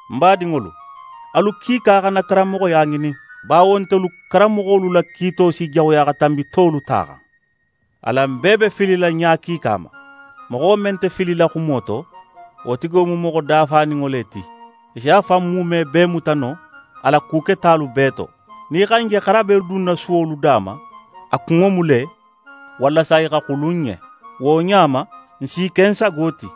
Ń badinŋolu, alu kiika xana karanmoxoya ŋinin, bawo ntelu karanmoxolu la kiito si jaxuya xa tanbi tolu ta xan. Alan bee be filila ɲa kiika ma. Moxo men nte filila xumo to, wo tigo mu moxo dafaninŋo le ti. A si a fan muume bee muta no a la ku ketalu bee to. Nin í xa n je xarabe dunna suwolu da ma, a kunŋo mu le, walasa i xa xulu n ɲen. Wo ɲa ma, n s'i ke n sago ti.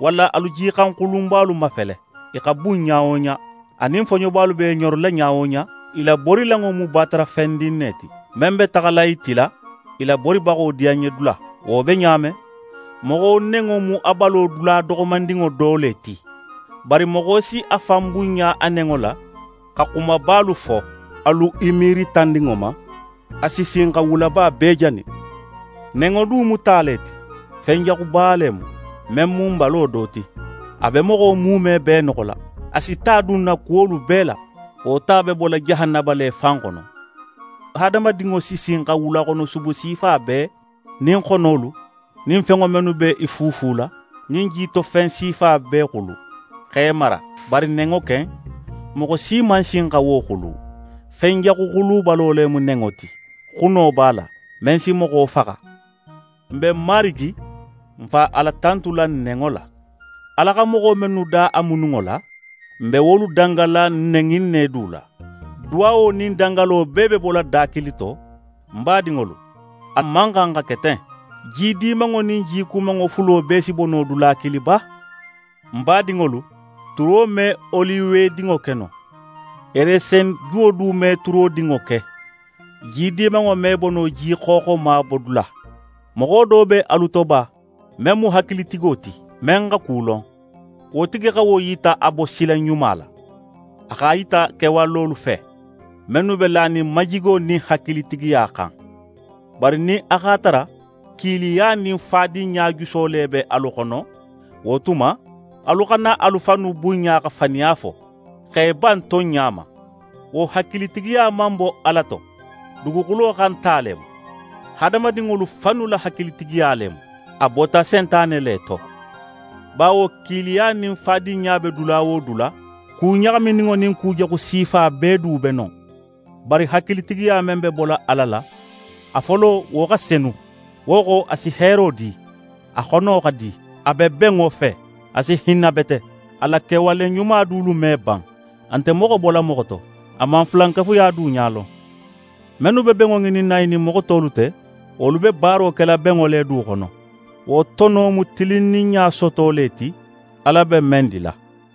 Walla alu jixanxulunbalu mafele. I xa bun ɲa wo ɲa, anin foɲobalu b'e ɲorila ɲa wo ɲa, i laborilanŋo mu batarafendin ne ti, men be taxala i tila i laboribaxo diyanɲedula. Wo be ɲa men, moxo nenŋo mu a balo dula doxomandinŋo do le ti. Bari moxo si a fan bunɲa a nenŋo la, xa xumabalu fo. Alu i miiri tandinŋo ma, a si sin xa wulaba bee jani. Nenŋo du mu ta le ti. Fenjaxuba le mu, men mu n balo do ti. A be moxo muume bee noxola. A si ta dun n na kuwolu bee la. Wo ta be bola jahanaba le fan xono. Hadamadinŋo si sin xa wulaxonosubu sifa bee, nin xonolu, nin fenŋo mennu b'e fuufula, nin jitofen sifa bee xulu, x'e mara. Bari nenŋo ken, moxo si man sin xa wo xulu. Fen jaxu xulubalo le mu nenŋo ti. Xuno b'a la, men si moxo faxa. N be Marigi, n Fa Ala tantula n nenŋo la. Ala xa moxo mennu da a mununŋo la, n be wolu dangala nen in ne du la. Duwawo nin dangalo bee be bola da kilin to. Ń badinŋolu, a man xan xa ke ten. Ji dimanŋo nin ji kumanŋo fulo bee si bo no dula kilin ba? Ń badinŋolu, turo me oliwedinŋo ke no. Resenjuwo du me turodinŋo ke. Ji dimanŋo me bo no ji xooxoma bodula. Moxo do be alu to ba, men mu hakilitigo ti, men xa ku lon? Wo tigi xa wo yita a bosila ɲuma la. A x'a yita kewalolu fe, mennu be lanin majigo nin hakilitigiya xan. Bari nin a x'a tara kiiliya nin fadinɲa juso le be alu xono, wo tuma, alu xana alu fannu bunɲa xa faniya fo, x'e ban tonɲa ma. Wo hakilitigiya man bo Ala to. Duguxulo xan ta le mu. Hadamadinŋolu fannu la hakilitigiya le mu. A bota Sentane le to. Bawo kiiliya nin fadinɲa be dula wo dula, ku ɲaxamininŋo nin kujaxu sifa bee du be non. Bari hakilitigiya men be bola Ala la, a folo wo xa senu, wo xo, a si heero di, a xono xa di, a be benŋo fe. A si hinna bete, a la kewale ɲuma dulu me ban; a nte moxo bola moxo to, a man fulankafuya du ɲa lon. Mennu be benŋo ŋininna i nin moxo tolu te, wolu be baaro kela benŋo le du xono. Wo tono mu tilinninɲa soto le ti, Ala be men dila.